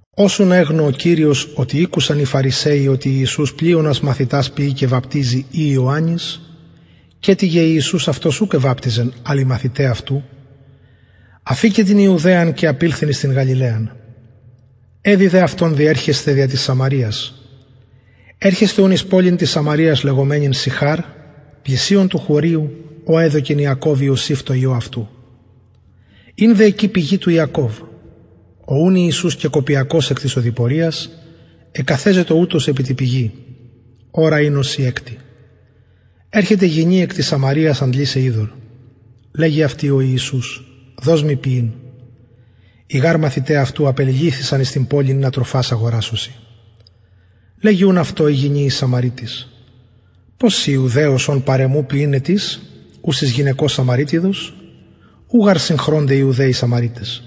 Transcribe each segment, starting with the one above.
ως ουν εγνω ο κυριος οτι ηκουσαν οι φαρισαιοι οτι ιησους πλειονας μαθητας ποιει και βαπτιζει η ιωαννης καιτοιγε ιησους αυτος ουκ εβαπτιζεν αλλ οι μαθηται αυτου αφηκεν την ιουδαιαν και απηλθεν εις την γαλιλαιαν εδει δε αυτον διερχεσθαι δια της σαμαρειας ερχεται ουν εις πολιν της σαμαρειας λεγομενην συχαρ πλησιον του χωριου ο εδωκεν ιακωβ ιωσηφ τω υιω αυτου ην δε εκει πηγη του ιακωβ ο ουν ιησους κεκοπιακως εκ της οδοιποριας εκαθεζετο ουτως επι τη πηγη ωρα ην ωσει εκτη ερχεται γυνη εκ της σαμαρειας αντλησαι υδωρ λεγει αυτη ο ιησους δος μοι πιειν οι γαρ μαθηται αυτου απεληλυθεισαν εις την πολιν ινα τροφας αγορασωσιν λεγει ουν αυτω η γυνη η σαμαρειτις πως συ ιουδαιος ων παρ εμου πιειν αιτεις ουσης γυναικος σαμαρειτιδος ου γαρ συγχρωνται ιουδαιοι σαμαρειταις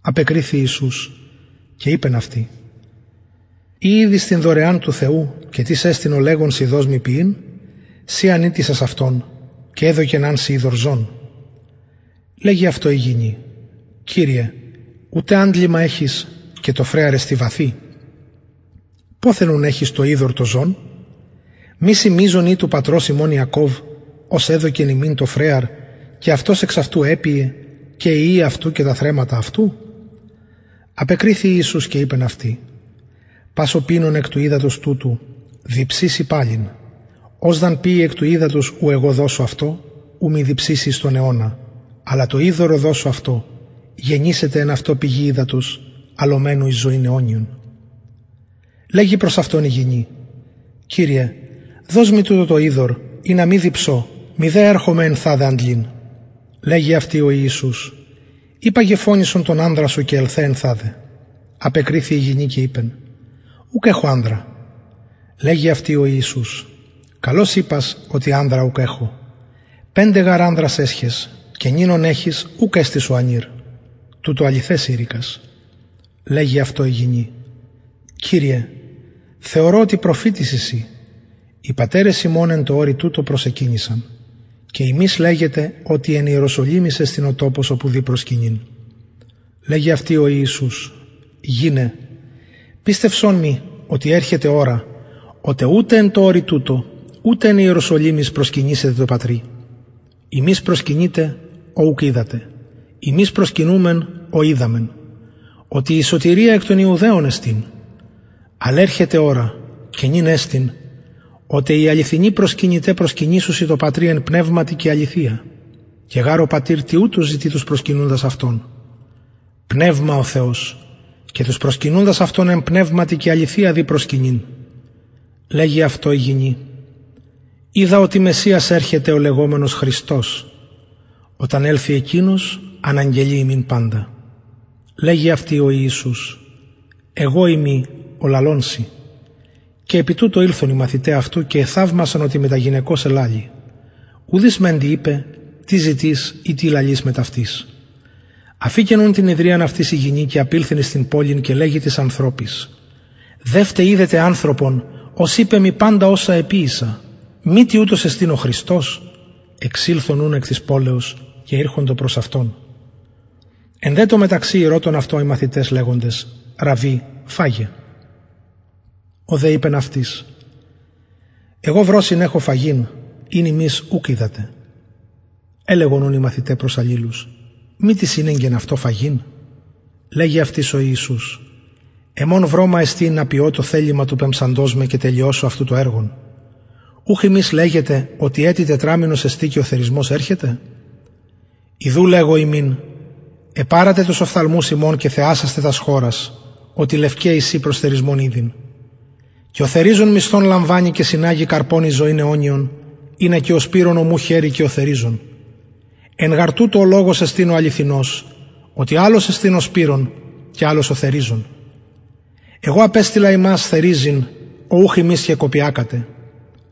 απεκριθη ιησους και ειπεν αυτη ει ηδεις την δωρεαν του θεου και τις εστιν ο λεγων σοι δος μοι πιειν συ αν ητησας αυτον και εδωκεν αν σοι υδωρ ζων λεγει αυτω η γυνη κυριε ουτε αντλημα εχεις και το φρεαρ εστιν βαθυ ποθεν ουν εχεις το υδωρ το ζων μη συ μειζων ει του πατρος ημων ιακωβ ος εδωκεν ημιν το φρεαρ και αυτος εξ αυτου επιεν και οι υιοι αυτου και τα θρεμματα αυτου απεκριθη ιησους και ειπεν αυτη πας ο πινων εκ του υδατος τουτου διψησει παλιν ος δ αν πιη εκ του υδατος ου εγω δωσω αυτω ου μη διψηση εις τον αιωνα αλλα το υδωρ ο δωσω αυτω γενησεται εν αυτω πηγη υδατος αλλομενου εις ζωην αιωνιον λεγει προς αυτον η γυνη κυριε δος μοι τουτο το υδωρ ινα μη διψω μηδε ερχομαι ενθαδε αντλειν λεγει αυτη ο ιησους υπαγε φωνησον τον ανδρα σου και ελθε ενθαδε απεκριθη η γυνη και ειπεν ουκ εχω ανδρα λεγει αυτη ο ιησους καλως ειπας οτι ανδρα ουκ εχω πεντε γαρ ανδρας εσχες και νυν ον εχεις ουκ εστιν σου ανηρ τουτο αληθες ειρηκας λεγει αυτω η γυνη κυριε θεωρω οτι προφητης ει συ οι πατερες ημων εν τω ορει τουτω προσεκυνησαν και υμεις λεγετε οτι εν ιεροσολυμοις εστιν ο τοπος οπου δει προσκυνειν λεγει αυτη ο ιησους γυναι πιστευσον μοι οτι ερχεται ωρα οτε ουτε εν τω ορει τουτω ουτε εν ιεροσολυμοις προσκυνησετε τω πατρι υμεις προσκυνειτε ο ουκ οιδατε ημεις προσκυνουμεν ο οιδαμεν οτι η σωτηρια εκ των ιουδαιων εστιν αλλ ερχεται ωρα και νυν εστιν οτε οι αληθινοι προσκυνηται προσκυνησουσιν τω πατρι εν πνευματι και αληθεια και γαρ ο πατηρ τοιουτους ζητει τους προσκυνουντας αυτον πνευμα ο θεος και τους προσκυνουντας αυτον εν πνευματι και αληθεια δει προσκυνειν λεγει αυτω η γυνη οιδα οτι μεσιας ερχεται ο λεγομενος χριστος οταν ελθη εκεινος αναγγελει ημιν παντα λεγει αυτη ο ιησους εγω ειμι ο λαλων σοι και επι τουτω ηλθον οι μαθηται αυτου και εθαυμασαν οτι μετα γυναικος ελαλει ουδεις μεντοι ειπεν τι ζητεις η τι λαλεις μετ αυτης αφηκεν ουν την υδριαν αυτης η γυνη και απηλθεν εις την πολιν και λεγει τοις ανθρωποις δευτε ιδετε ανθρωπον ος ειπεν μοι παντα οσα εποιησα μητι ουτος εστιν ο χριστος εξηλθον εκ της πολεως και ηρχοντο προς αυτον εν δε τω μεταξυ ηρωτων αυτον οι μαθηται λεγοντες ραββι φαγε ο δε ειπεν αυτοις εγω βρωσιν εχω φαγειν ην υμεις ουκ οιδατε ελεγον ουν οι μαθηται προς αλληλους μη τις ηνεγκεν αυτω φαγειν λεγει αυτοις ο ιησους εμον βρωμα εστιν ινα ποιω το θελημα του πεμψαντος με και τελειωσω αυτου το εργον ουχ υμεις λεγετε οτι ετι τετραμηνος εστιν και ο θερισμος ερχεται ιδου λεγω υμιν επαρατε τους οφθαλμους υμων και θεασασθε τας χωρας οτι λευκαι εισιν προς θερισμον ηδη και ο θεριζων μισθον λαμβανει και συναγει καρπον εις ζωην αιωνιον ινα και ο σπειρων ομου χαιρη και ο θεριζων εν γαρ τουτω ο λογος εστιν ο αληθινος οτι αλλος εστιν ο σπειρων και αλλος ο θεριζων εγω απεστειλα υμας θεριζειν ο ουχ υμεις κεκοπιακατε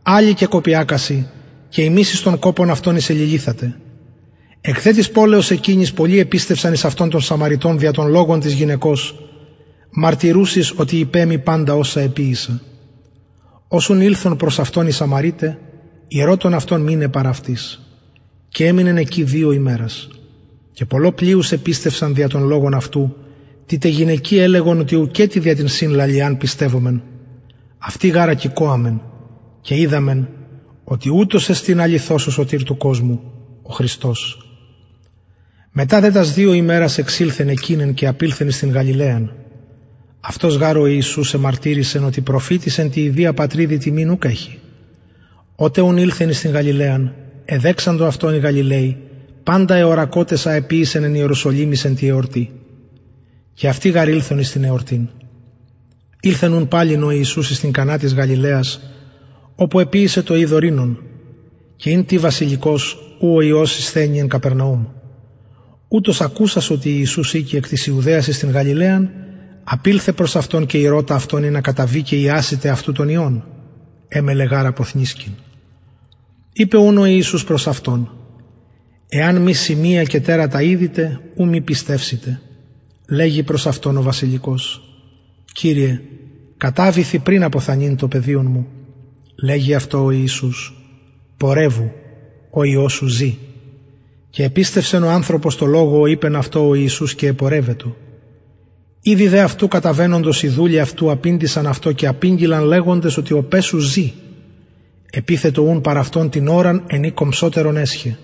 αλλοι κεκοπιακασιν και υμεις εις τον κοπον αυτων εισεληλυθατε εκ δε της πολεως εκεινης πολλοι επιστευσαν εις αυτον των σαμαρειτων δια τον λογον της γυναικος μαρτυρουσης οτι ειπεν μοι παντα οσα εποιησα ως ουν ηλθον προς αυτον οι σαμαρειται ηρωτων αυτον μειναι παρ αυτοις και εμεινεν εκει δυο ημερας και πολλω πλειους επιστευσαν δια τον λογον αυτου τη τε γυναικι ελεγον οτι ουκετι δια την σην λαλιαν πιστευομεν αυτοι γαρ ακηκοαμεν και οιδαμεν οτι ουτος εστιν αληθως ο σωτηρ του κοσμου ο χριστος μετα δε τας δυο ημερας εξηλθεν εκειθεν και απηλθεν εις την γαλιλαιαν αυτος γαρ ο ιησους εμαρτυρησεν οτι προφητης εν τη ιδια πατριδι τιμην ουκ εχει οτε ουν ηλθεν εις την γαλιλαιαν εδεξαντο αυτον οι γαλιλαιοι παντα εωρακοτες α εποιησεν εν ιεροσολυμοις εν τη εορτη και αυτοι γαρ ηλθον εις την εορτην ηλθεν ουν παλιν ο ιησους εις την κανα της γαλιλαιας οπου εποιησεν το υδωρ οινον και ην τις βασιλικος ου ο υιος ησθενει εν καπερναουμ ουτος ακουσας οτι ιησους ηκει εκ της ιουδαιας εις την γαλιλαιαν απηλθεν προς αυτον και ηρωτα αυτον ινα καταβη και ιασηται αυτου τον υιον εμελλεν γαρ αποθνησκειν ειπεν ουν ο ιησους προς αυτον εαν μη σημεια και τερατα ιδητε ου μη πιστευσητε λεγει προς αυτον ο βασιλικος κυριε καταβηθι πριν αποθανειν το παιδιον μου λεγει αυτω ο ιησους πορευου ο υιος σου ζη και επιστευσεν ο ανθρωπος τω λογω ω ειπεν αυτω ο ιησους και επορευετο ηδη δε αυτου καταβαινοντος οι δουλοι αυτου απηντησαν αυτω και απηγγειλαν λεγοντες οτι ο παις σου ζη επυθετο ουν παρ αυτων την ωραν εν η κομψοτερον εσχεν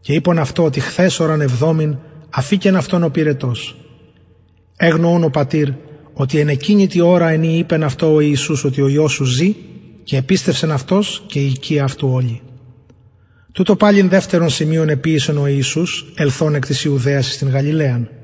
και ειπον αυτω οτι χθες ωραν εβδομην αφηκεν αυτον ο πυρετος εγνω ουν ο πατηρ οτι εν εκεινη τη ωρα εν η ειπεν αυτω ο ιησους οτι ο υιος σου ζη και επιστευσεν αυτος και η οικια αυτου ολη τουτο παλιν δευτερον σημειον εποιησεν ο ιησους ελθων εκ της ιουδαιας εις την γαλιλαιαν